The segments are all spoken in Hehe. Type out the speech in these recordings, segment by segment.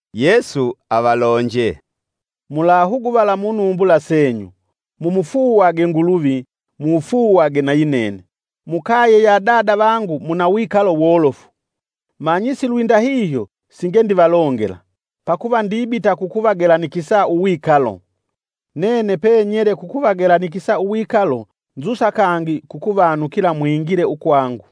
Yesu avalonje, “Mulahuguvala munumbula senyu. Mumufuuwagwe Nguluvi, mufuuwagwe nayi nene. Mukaye ya Dada vangu muna wikalo wolofu; manyi silwindahihyo singe ndivalongela, pakuva ndibita kukuvagelanikisa uwikalo. Nene penyele kukuvagelanikisa wikalo nzusa kangi kukuvanukila mwingile ukwangu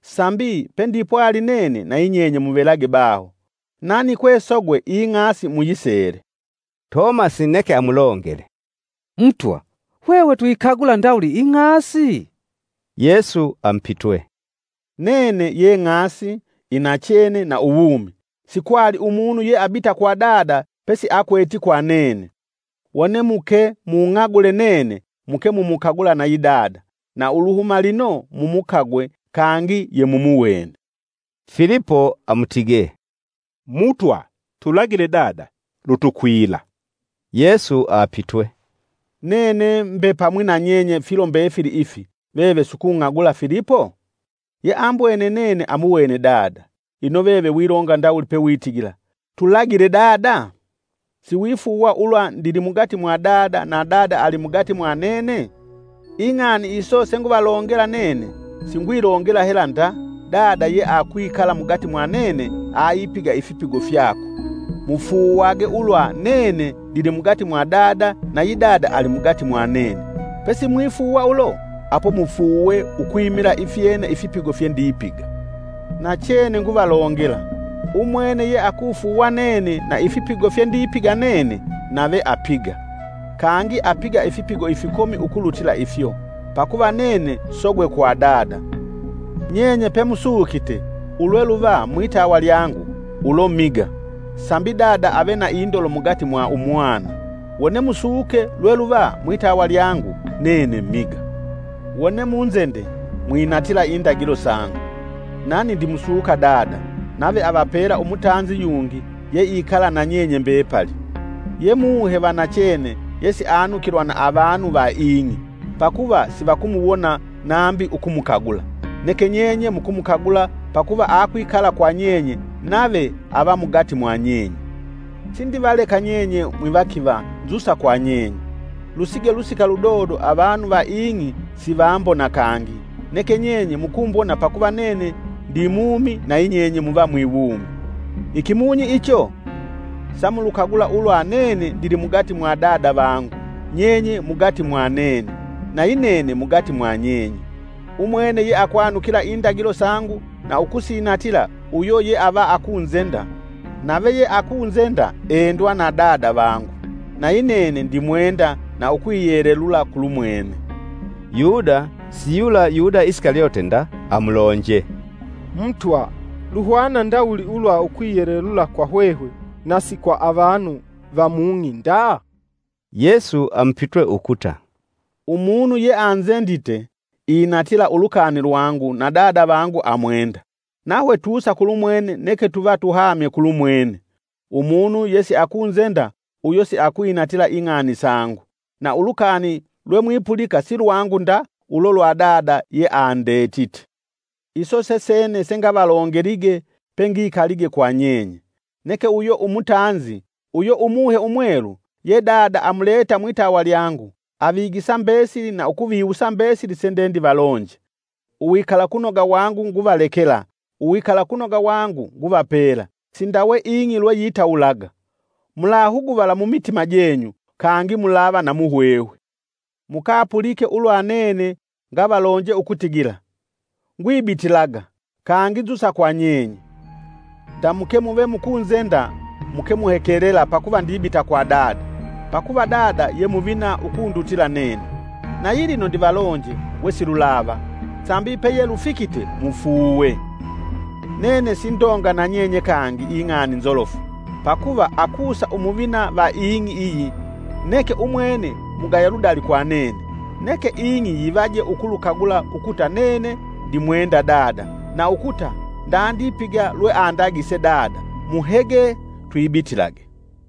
sambi pendi pwali nene nayi nyenye muvelage baho. Nani kwesogwe ing'asi muyisele.” Tomasi neke amulongele, “Mutwa, hwehwe tuyikagula ndawuli ing'asi?” Yesu amupitwe, “Nene ye ng'asi, inachene na uwumi, sikwali umunu yeabita kwa Dada pesiakweti kwa nene.” Wone muke, “Mukung'agule nene muke mukumukagula nayi dada. Na uluhuma lino mumukagwe, kangi yemumuwene.” Filipo amutige, “Mutwa, tulagile Dada, lutukwila.” Yesu apitwe, “Nene mbe pamwi na nyenye filo mbefili ifi veve sukung'agula Filipo? Yeambwene nene amuwene Dada. Ino veve wilonga ndawuli pewitigila, ‘Tulagile dada?’ Siwifuuwa ulwa ndilimugati mwa dada na Dada alimugati mwa nene? Ing'ani iso senguvalongela nene singwilongela hela nda, Dada yeakwikala mugati mwa nene aipiga ifipigo fyakwe. Mufuuwage ulwa nene ndilimugati mwa dada nayi dada alimugati mwa nene. Pesimwifuuwa ulo apo mufuuwe ukwimila ifyene ifipigo fyendipiga. Nachene nguvalongela, umwene yeakufuuwa nene na ifipigo fyendipiga nene nave apiga, kangi apiga ifipigo ifikomi, ukulutila ifyo, pakuva nene sogwe kwa Dada. Nyenye pemusukite ulweluva mwitawa lyangu, ulo miga sambi Dada ave na indolo mugati mwa Umwana. Wone musuke lulweluva mwitawa lyangu, nene miga. “Wone munzende, mwinatila indagilo sangu. Nani ndimusuka Dada, nave avapela Umutanzi yungi yeikala na nyenye mbepali. Ye Muhe, vanachene yesianukilwa na avanu va ing'i, pakuva sivakumuwona nambi ukumukagula. Neke nyenye mukumukagula, pakuva akwikala kwa nyenye nave ava mugati mwa nyenye. “Sindivaleka nyenye mwivakiva nzusa kwa nyenye. Lusige lusika ludodo avanu va ing'i sivambona kangi, neke nyenye mukumbona pakuva nene ndimumi nayi nyenye muva mwiwumi. Ikimunyi icho, samulukagula ulwa nene ndili mugati mwadada vangu, nyenye mugati mwa nene, nayi nene mugati mwanyenye. Umwene yeakwanukila indagilo sangu na ukusinatila uyo yeava akunzenda, nave yeakunzenda endwa na Bada vangu nayi nene ndimwenda na ukwiyelelula kulumwene!” Yuda (siyula Yuda Isikalyote nda) amulonje, “Mutwa luhwana ndawuli ulwa ukwiyelelula kwa hwehwe nasi kwa avanu va mung'i nda?” Yesu amupitwe ukuta, “Umunu yeanzendite inatila ulukani lwangu na Dada vangu amwenda, nahwe tusa kulumwene neke tuva tuhamye kulumwene. Umunu yesiakunzenda uyo siakwinatila ing'ani sangu. Na ulukani lwemwipulika silwangu nda ulo lwa Dada yeandetite. “Iso sesene sengavalongelige pengikalige kwa nyenye neke uyo Umutanzi, uyo Umuhe Umwelu, ye Dada amuleta mwitawa lyangu, avigisa mbesili na ukuviwusa mbesili sendendivalonje. “Uwikalakunoga wangu nguvalekela; uwikalakunoga wangu nguvapela; sindawe ing'i lweyitawulaga. Mulahuguvala mumitima jenyu kangi mulava na muhwehwe. Mukapulike ulwa nene ngavalonje ukutigila: ‘Ngwibitilaga, kangi nzusa kwa nyenye.’ Ndamuke muve mukunzenda muke muhekelela pakuva ndibita kwa Dada. Pakuva Dada ye muvina ukundutila nene. Nayilino ndivalonje wesilulava, sambi peyelufikite mufuuwe. Nene sindonga na nyenye kangi ing'ani nzolofu, pakuva akusa umuvina va ing'i iyi, neke umwene mugaya ludali kwa nene; Neke ing'i yivaje ukulukagula ukuta nene ndimwenda Dada, na ukuta ndandipiga lweandagise Dada. Muhege, twibitilage!